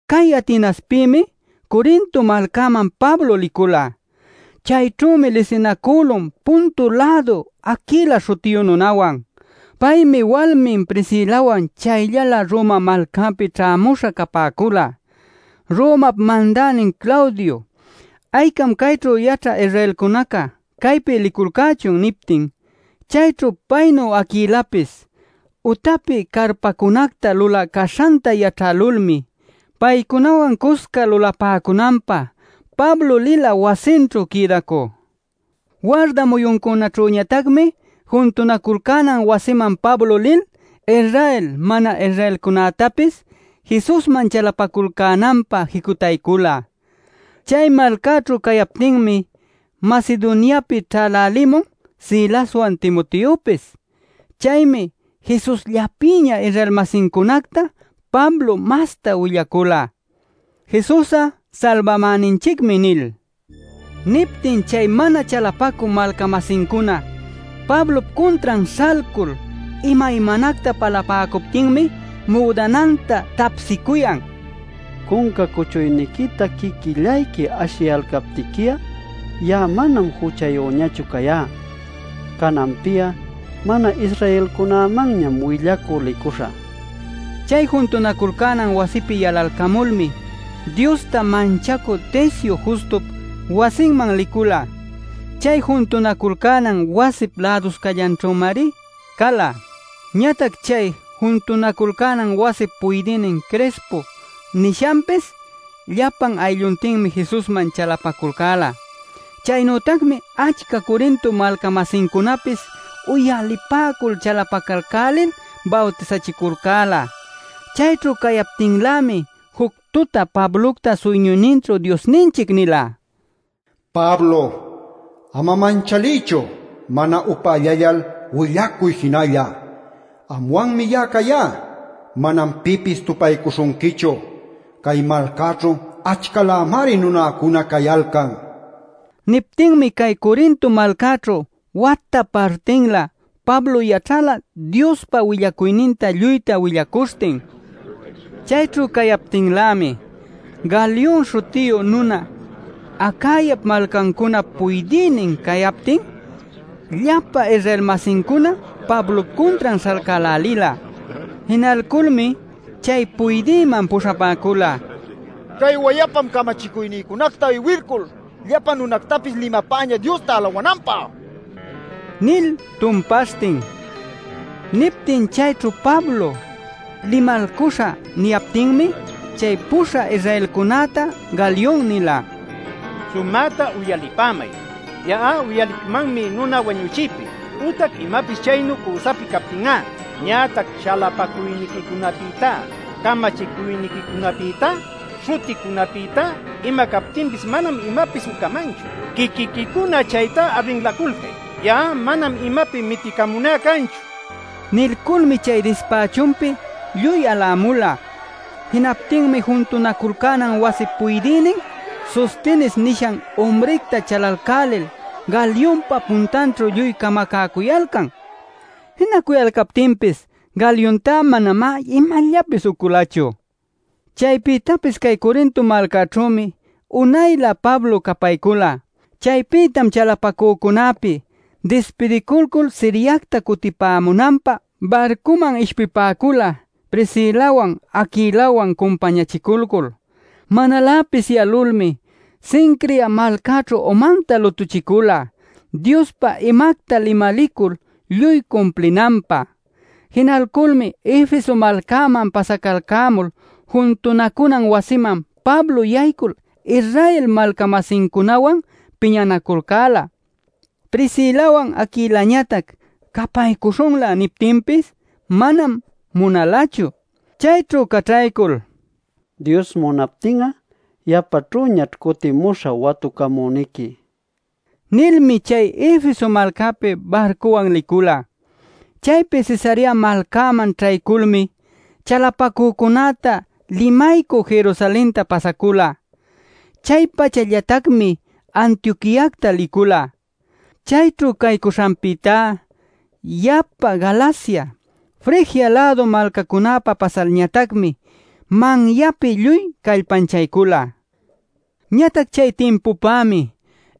Cay Atenaspïmi, Corinto malcäman Pablo licula. Chayćhümi lisinacülun Ponto-lädu Aquila śhutiyu nunawan. Paymi walmin Priscilawan chayllalä Roma malcäpi ćhämuśha capäcula Romap Mandänin Claudio: “Aycam cayćhu yaćhä Israelcunaca caypi liculcächun” niptin. Chayćhu paynu Aquilapis utapi carpacunacta lulä caśhanta yaćhälulmi paycunawan cuscan lulapäcunanpä Pablo lila wasinćhu quïdacü. Warda muyuncunaćhüñatacmi juntunaculcänan wasiman Pablo lil Israel mana-Israelcunätapis Jesusman chalapaculcänanpä jicutaycula. Chay malcaćhu cayaptinmi Macedoniapi ćhälälimun Silaswan Timoteopis. Chaymi Jesusllapïña Israel-masincunacta Pablo mastá willacula “Jesus'a Salbamäninchicmi” nil. Niptin chay mana chalapacü malca-masincuna Pablop cuntran śhalcul imaymanacta palapäcuptinmi müdananta tapsicuyan: “Cunca cuchuyniquita quiquillayqui ashiyalcaptiqui'a ya'a manam juchayüñachu cayá. Cananpi'a, mana-Israelcunämanñam willacü licuśhä” nil. Chay juntunaculcänan wasipi yalalcamulmi Diosta manchacü Ticio Justup wasinman licula. Chay juntunaculcänan wasip läduscallanćhümari cala. Ñatac chay juntunaculcänan wasip puydïnin Crispo nishanpis llapa aylluntinmi Jesusman chalapaculcäla. Chaynütacmi achca Corinto malca-masincunapis uyalipäcul chalapacalcälil bawtisachiculcäla. Chayćhu cayaptinlämi juc tuta Pablocta suyñuyninćhu Diosninchic nila: “Pablo, ama manchaliychu; mana upällallal, willacuy jinalla. Anwanmi ya'a cayá; manam pipis tupaycuśhunquichu. Cay malcaćhu achcalämari nunäcuna cayalcan” nil. Niptinmi cay Corinto malcäćhu wata partinlä Pablo yaćhala Diospa willacuyninta lluyta willacuśhtin. Chayćhu cayaptinlämi, Galion śhutiyu nuna Acayap malcancunap puydïnin cayaptin llapa Israel-masincuna Pablop cuntran śhalcälälila. Jinalculmi chay puydïman puśhapäcula: “Cay wayapam camachicuynïcunacta iwilcul llapa nunactapis limapäñä Diosta alawananpä” nil tumpaśhtin. Niptin chayćhu Pablo “limalcuśhä” niyaptinmi chay puśhä Israelcunäta Galion nila: “Sumäta uyalipämay. Ya'a uyalicmanmi nuna wañuchiypi, ütac imapis chaynu cüsapi captin'a. Ñatac chalapacuyniquicunapïtá, camachicuyniquicunapïtá, śhuticunapïtá, ima captinpis manam imapis ucamanchu. Quiquiquicuna chaytá arrinläculcay; ya'a manam imapi miticamuná canchu” nil. Nilculmi chay dispächunpi lluy alämula. Jinaptinmi juntunaculcänan wasip puydïnin Sostenes nishan umricta chalalcälil, Galionpa puntanćhu lluy camacäcuyalcan. Jinacuyalcaptinpis Galiontá manamá imallapis uculachu. Chaypïtapis cay Corinto malcäćhümi unaylä Pablo capaycula. Chaypïtam chalapacücunäpi dispidiculcul Siriacta cutipämunanpä barcuman ishpipäcula Priscilawan Aquilawan cumpañachiculcul. Manaläpis yalulmi Cencrea malcäćhu umanta lutuchicula, Diospa imacta limalicul lluy cumplinanpä. Jinalculmi Efeso malcäman pasacalcämul juntunacunan wasiman Pablo yaycul Israel malca-masincunawan piñanaculcäla. Priscilawan Aquilañatac “capaycuśhunlä” niptinpis manam munalachu. Chayćhu caćhaycul: “Dios munaptin'a, yapaćhüñaćh cutimuśhä watucamüniqui” nilmi chay Efeso malcäpi barcuwan licula. Chaypi Cesarea malcäman ćhayculmi chalapacücunäta limaycü Jerusalenta pasacula. Chay-pachallatacmi Antioquiacta licula. Chayćhu caycuśhanpïtá yapa Galacia, Frigia-lädu malcacunäpa pasalñatacmi manyapi lluy callpanchaycula. Ñatac chay timpupämi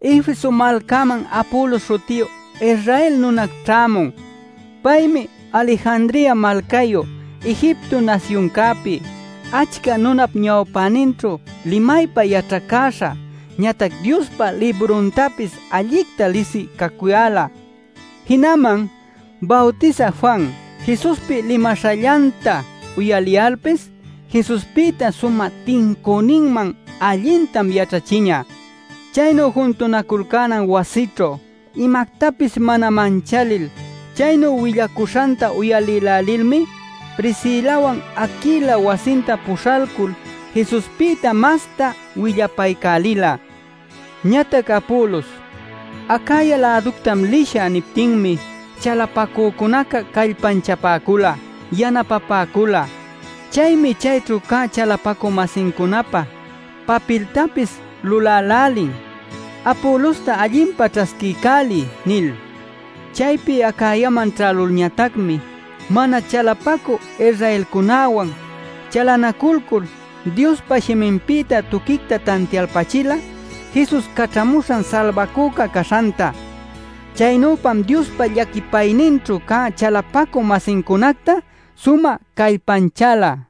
Efeso malcäman Apolos śhutiyu Israel nuna ćhämun. Paymi Alejandria malcayu Egipto nasyuncäpi, achca nunap ñawpäninćhu limaypa yaćhacäśha, ñatac Diospa libruntapis allicta lisï cacuyäla. Jinaman Bawtisä Juan, Jesuspi limaśhallanta uyaliyalpis Jesuspïta sumä tincüninman allintam yaćhachiñä. Chaynu juntunaculcänan wasićhu imactapis mana manchalil chaynu willacuśhanta uyalïlälilmi Priscilawan Aquila wasinta puśhalcul Jesuspïta masta willapaycälila. Ñatac Apolos: “Acaya-läductam lishä” niptinmi chalapacücunaca callpanchapäcula, yanapapäcula. Chaymi chayćhu cä chalapacü-masincunapä papiltapis lulälälin “Apolosta allinpa ćhasquiycäliy” nil. Chaypi Acayaman ćhälulñatacmi mana chalapacü Israelcunäwan chalanaculcul Diospa shiminpïta tuquicta tantialpachila Jesus caćhamuśhan Salbacüca caśhanta. Chaynüpam Diospa llaquipayninćhu cä chalapacü-masincunacta sumä callpanchäla.